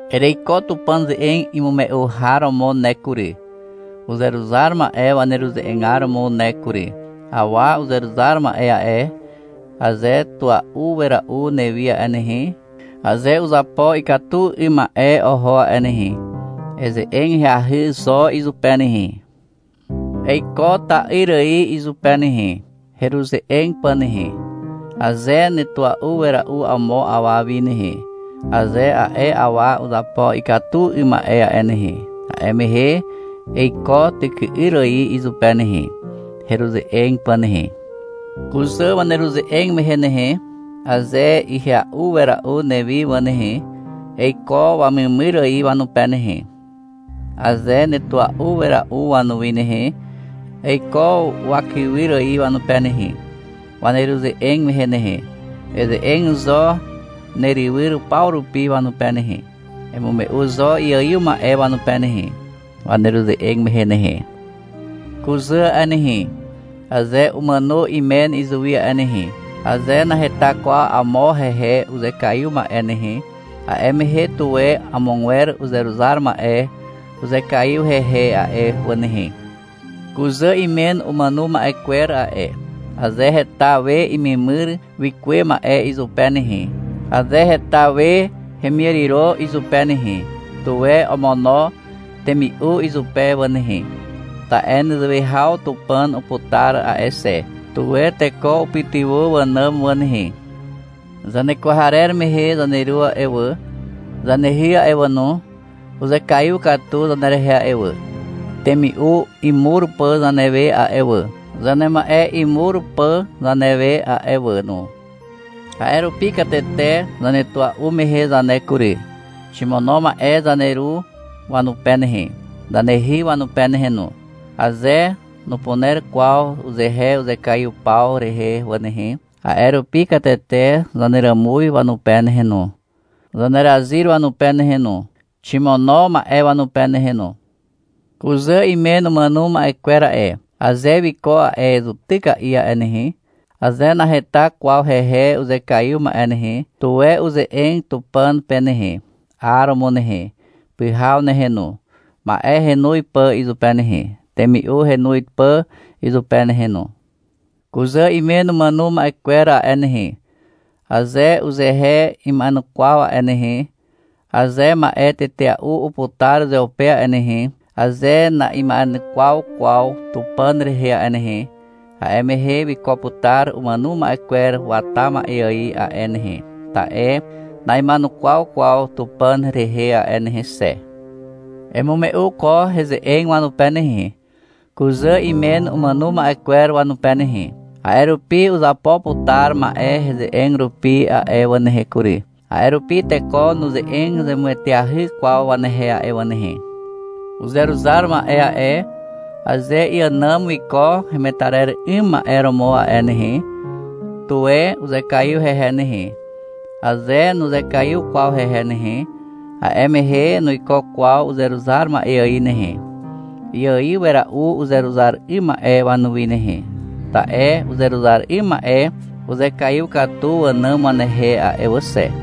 Ereiko Tupàn ze'eg imume'u har romo ne kury, uzeruzar ma'e waneruze'egar romo ne kury. Awa uzeruzar ma'e a'e, aze tua'u wera'u newi a'e nehe, aze uzapo ikatu 'ym ma'e oho a'e nehe, eze'eg ahyahy zo izupe nehe. Eiko ta'yr ài izupe nehe, heruze'eg pà nehe. Aze netua'u wera'u amo awa wi nehe, aze a'e awa uzapo ikatu 'ym ma'e a'e nehe, a'e mehe eiko tyky'yr ài izupe nehe, heruze'eg pà nehe. Kuzà waneruze'eg mehe nehe, aze ihya'u wera'u newi wà nehe, eiko wamemyr ài wanupe nehe. Aze netua'u wera'u wanuwi nehe, eiko wakywyr ài wanupe nehe, waneruze'eg mehe nehe. Eze'eg zo neruryw paw rupi wanupe nehe. Emume'u zo iaiw ma'e wanupe nehe, waneruze'eg mehe nehe. Kuzà a'e nehe, aze umàno imen izuwi a'e nehe, aze naheta kwaw amo hehe uzekaiw ma'e nehe, a'e mehe tuwe amogwer uzeruzar ma'e uzekaiw hehe a'e wà nehe. Kuzà imen umàno ma'e kwer a'e, aze heta we imemyr wikuwe ma'e izupe nehe, aze heta we hemiàriro izupe nehe, tuwe omono temi'u izupe wà nehe. Ta'e nezewe haw Tupàn uputar a'e xe. Tuwe teko upytywà wànàm wà nehe. Zanekwarer mehe zaneru a'e wà, zanehy a'e wà no, uzekaiw katu zanerehe a'e wà, temi'u imur pà zanewe a'e wà, zanema'e imur pà zanewe a'e wà no. A'e rupi katete zanetua'u mehe zane kury, ximono ma'e zaneru wanupe nehe, zanehy wanupe nehe no, aze nupuner kwaw uzehe uzekaiw paw rehe wà nehe. A'e rupi katete zaneràmuz wanupe nehe no, zanezaryz wanupe nehe no, ximono ma'e wanupe nehe no. Kuzà imen umàno ma'e kwer a'e, aze wiko a'e zutyka'i a'e nehe, aze naheta kwaw hehe uzekaiw ma'e nehe, tuwe uze'eg Tupàn pe nehe, 'aromo nehe, pyhaw nehe no, ma'e henoz pà izupe nehe, temi'u henoz pà izupe nehe no. Kuzà imen umàno ma'e kwer a'e nehe, aze uzehe ima'enukwaw a'e nehe, aze ma'e tetea'u uputar uzeupe a'e nehe, aze na'ima'enukwaw kwaw Tupàn rehe a'e nehe, a'e mehe wiko putar umàno ma'e kwer wata ma'e ài a'e nehe, ta'e na'ima'enukwaw kwaw Tupàn rehe a'e nehe xe. Emume'u ko heze'eg wanupe nehe, kuzà imen umàno ma'e kwer wanupe nehe. A'e rupi uzapo putar ma'e heze'eg rupi a'e wà nehe kury. A'e rupi teko nuze'eg zemueteahy kwaw wanehe a'e wà nehe. Uzeruzar ma'e a'e, aze iànàm wiko hemetarer 'ym ma'e romo a'e nehe, tuwe uzekaiw hehe nehe. Aze nuzekaiw kwaw hehe nehe, a'e mehe nuiko kwaw uzeruzar ma'e ài nehe. Iaiw wera'u uzeruzar 'ym ma'e wanuwi nehe, ta'e uzeruzar 'ym ma'e uzekaiw katu wànàm wanehe a'e wà xe.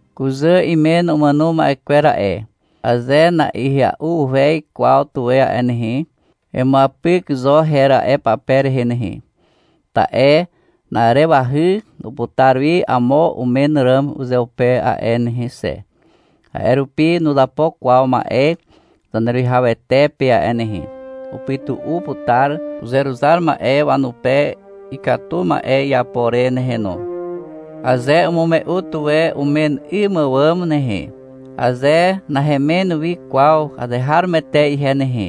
Kuzà imen umàno ma'e kwer a'e, aze nahya'uhez kwaw tuwe a'e nehe, emuapyk zo her a'e pape rehe nehe. Ta'e na'arewahy uputar wi amo umen ràm uzeupe a'e nehe xe. A'e rupi nuzapo kwaw ma'e Zaneruwihawete pe a'e nehe. Upytu'u putar uzeruzar ma'e wanupe ikatu ma'e iapo re nehe no. Aze umume'u tuwe umen 'ym àwàm nehe, aze — Nahemen wi kwaw azeharomoete ihe nehe,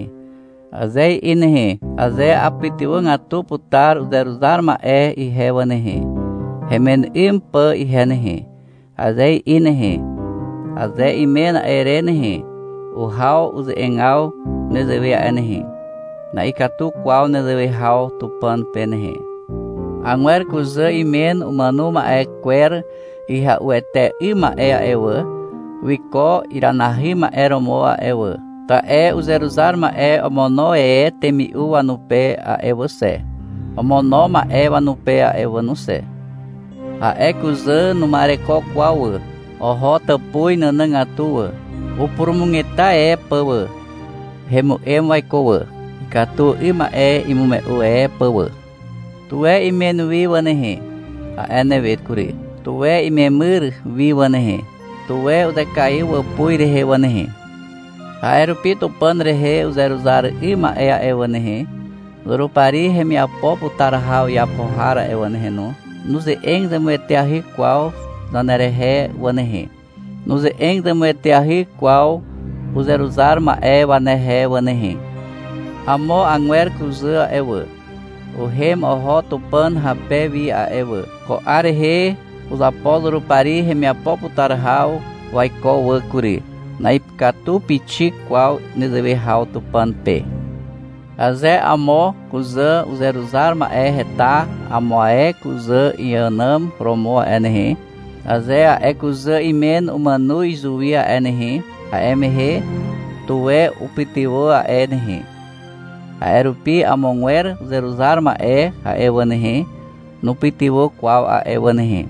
aze i'i nehe, aze — Apytywàgatu putar uzeruzar ma'e ihe wà nehe, hemen 'ym pà ihe nehe, aze i'i nehe, aze imen a'e re nehe, uhaw uze'egaw nezewe a'e nehe. Na'ikatu kwaw nezewe haw Tupàn pe nehe. Agwer kuzà imen umàno ma'e kwer ihya'uete 'ym ma'e a'e wà, wiko iranahy ma'e romo a'e wà, ta'e uzeruzar ma'e omono e temi'u wanupe a'e wà xe, omono ma'e wanupe a'e wà no xe. A'e kuzà numa'ereko kwaw wà. Oho tàpuz nànàgatu wà, upurumugeta e pà wà. Hemu'em waiko wà, ikatu 'ym ma'e imume'u e pà wà. — Tuwe imen wi wà nehe, a'e newe kury. Tuwe imemyr wi wà nehe. Tuwe uzekaiw wàpuz rehe wà nehe. A'e rupi Tupàn rehe uzeruzar 'ym ma'e a'e wà nehe, Zurupari hemiapo putar haw iapo har a'e wà nehe no, nuze'eg zemueteahy kwaw zanerehe wà nehe. Nuze'eg zemueteahy kwaw uzeruzar ma'e wanehe wà nehe. Amo agwer kuzà a'e wà, uhem oho Tupàn hape wi a'e wà. Ko 'ar rehe uzapo Zurupari hemiapo putar haw waiko wà kury. Na'ikatu pixik kwaw nezewe haw Tupàn pe. Aze amo kuzà uzeruzar ma'e heta amo ae kuzà iànàm romo a'e nehe, aze a'e kuzà imen umàno izuwi a'e nehe, a'e mehe, tuwe upytywà a'e nehe. A'e rupi amogwer uzeruzar ma'e a'e wà nehe, nupytywà kwaw a'e wà nehe.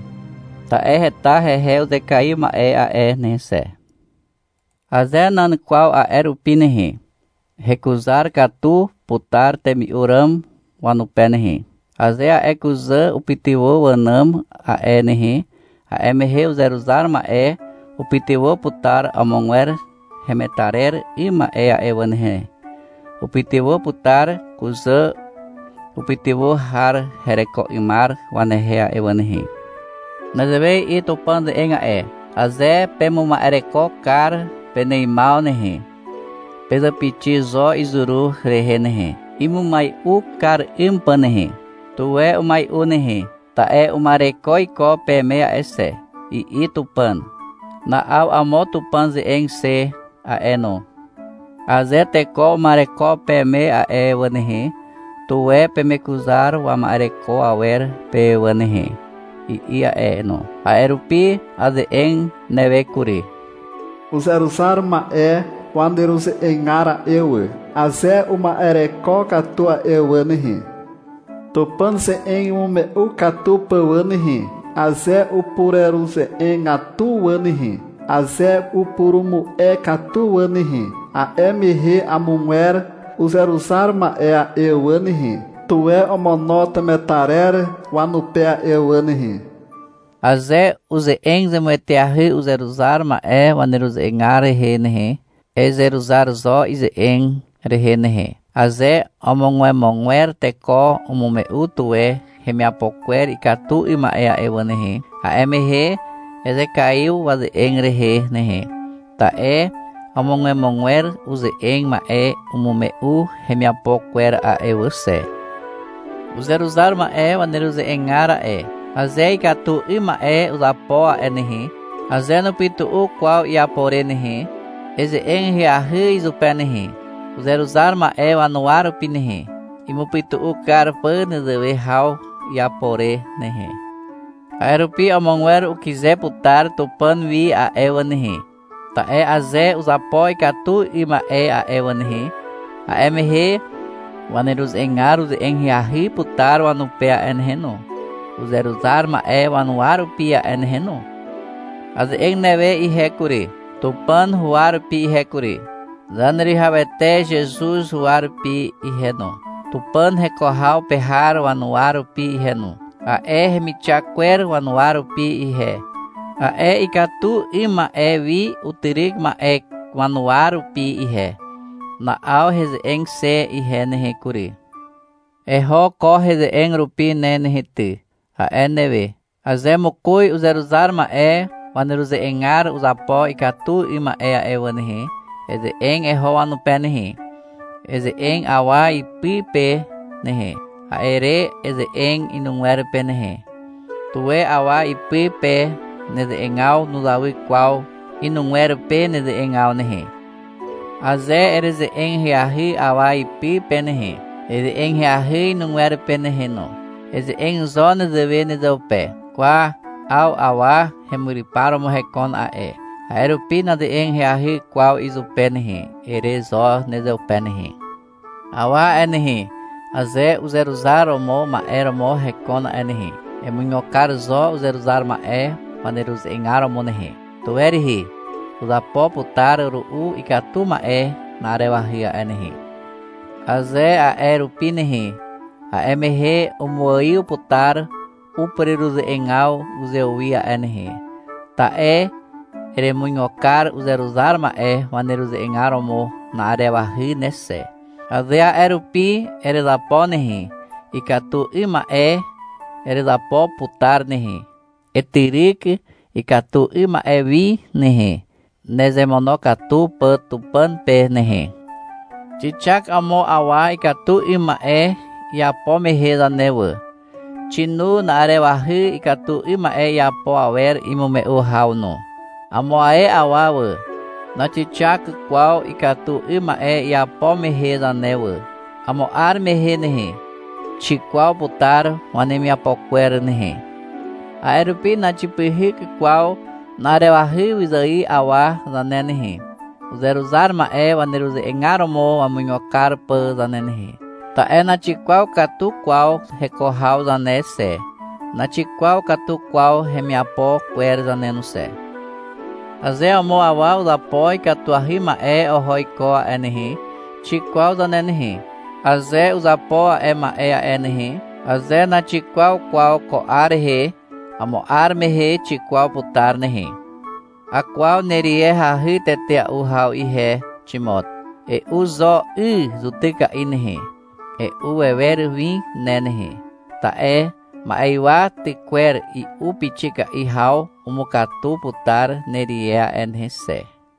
Ta'e heta hehe uzekaiw ma'e a'e nehe xe. Aze nan kwaw a'e rupi nehe, hekuzar katu putar temi'u ràm wanupe nehe. Aze a'e kuzà upytywà wànàm a'e nehe, a'e mehe uzeruzar ma'e upytywà putar amogwer hemetarer 'ym ma'e a'e wà nehe, upytywà putar kuzà upytywà har hereko 'ymar wanehe a'e wà nehe. Nezewe i'i Tupàn ze'eg a'e. — Aze pemuma'ereko kar peneimaw nehe, pezàpixi zo izuru rehe nehe, imumai'u kar 'ym pà nehe. Tuwe umai'u nehe, ta'e uma'ereko iko peme a'e xe, i'i Tupàn. Na'aw amo Tupàn ze'eg xe a'e no. — Aze teko uma'ereko peme a'e wà nehe, tuwe pemekuzar wama'ereko awer pe wà nehe, i'i a'e no. A'e rupi aze'eg newe kury. — Uzeruzar ma'e waneruze'egar a'e wà, aze uma'ereko katu a'e wà nehe, Tupàn ze'eg imume'u katu pà wà nehe, aze upureruze'egatu wà nehe, aze upurumu'e katu wà nehe, a'e mehe amogwer uzeruzar ma'e a'e wà nehe, tuwe omono temetarer wanupe a'e wà nehe. Aze uze'eg zemueteahy uzeruzar ma'e waneruze'egar rehe nehe, ezeruzar zo ize'egaw rehe nehe. Aze omogwemogwer teko umume'u tuwe hemiapo kwer ikatu 'ym ma'e a'e wà nehe, a'e mehe ezekaiw waze'eg rehe nehe. Ta'e omogwemogwer uze'eg ma'e umume'u hemiapo kwer a'e wà xe. Uzeruzar ma'e waneruze'egar a'e, aze ikatu 'ym ma'e uzapo a'e nehe, aze nupytu'u kwaw iapo re nehe, eze'eg ahyahy izupe nehe, uzeruzar ma'e wanuwa rupi nehe, imupytu'u kar pà nezewe haw iapo re nehe. A'e rupi amogwer ukyze putar Tupàn wi a'e wà nehe. Ta'e aze uzapo ikatu 'ym ma'e a'e wà nehe, a'e mehe waneruze'egar uze'eg ahyahy putar wanupe a'e nehe no, uzeruzar ma'e wanuwa rupi a'e nehe no. Aze'eg newe ihe kury, Tupàn huwa rupi ihe kury, Zaneruwihawete Zezuz huwa rupi ihe no, Tupàn heko haw pe har wanuwa rupi ihe no, a'e hemixak kwer wanuwa rupi ihe, a'e ikatu 'ym ma'e wi utyryk ma'e wanuwa rupi ihe. Na'aw heze'eg xe ihe nehe kury. — Eho ko heze'eg rupi ne nehe ty, a'e newe. Aze mokoz uzeruzar ma'e waneruze'egar uzapo ikatu 'ym ma'e a'e wà nehe, eze'eg eho wanupe nehe. Eze'eg awa ipy pe nehe. A'e re eze'eg inugwer pe nehe. Tuwe awa ipy pe neze'egaw nuzawy kwaw inugwer pe neze'egaw nehe. Aze ereze'eg ahyahy awa ipy pe nehe, eze'eg ahyahy inugwer pe nehe no. Eze'eg zo nezewe nezeupe. — Kwa, 'aw awa hemyrypar romo hekon a'e, a'e rupi naze'eg ahyahy kwaw izupe nehe, ere zo nezeupe nehe. Awa a'e nehe, aze uzeruzar romo ma'e romo hekon a'e nehe, emuigo kar zo uzeruzar ma'e waneruze'egar romo nehe. Tuwe rihi. Uzapo putar ru'u ikatu 'ym ma'e na'arewahy a'e nehe. Aze a'e rupi nehe, a'e mehe umuaiw putar upureruze'egaw uzewi a'e nehe, ta'e eremuigo kar uzeruzar ma'e waneruze'egar romo na'arewahy ne xe. Aze a'e rupi erezapo nehe, ikatu 'ym ma'e erezapo putar nehe. Etyryk ikatu 'ym ma'e wi nehe, nezemonokatu pà Tupàn pe nehe. Xixak amo awa ikatu 'ym ma'e iapo mehe zane wà, xinu na'arewahy ikatu 'ym ma'e iapo awer imume'u haw no. Amo ae awa wà, naxixak kwaw ikatu 'ym ma'e iapo mehe zane wà. Amo 'ar mehe nehe, xikwaw putar wanemiapo kwer nehe. A'e rupi naxipyhyk kwaw na'arewahy wyzài awa zane nehe, uzeruzar ma'e waneruze'egar romo imuigo kar pà zane nehe. Ta'e naxikwaw katu kwaw heko haw zane xe, naxikwaw katu kwaw hemiapo kwer zane no xe. Aze amo awa uzapo ikatuahy ma'e oho iko a'e nehe, xikwaw zane nehe. Aze uzapo a'e ma'e a'e nehe, aze naxikwaw kwaw ko 'ar rehe, amo 'ar mehe xikwaw putar nehe. Akwaw nerie hahy tetea'u haw ihe, Ximot. E'u zo 'y zutyka'i nehe, e'u wewer win ne nehe. Ta'e ma'ywa tykwer i'u pixika'i haw umukatu putar nerie a'e nehe xe.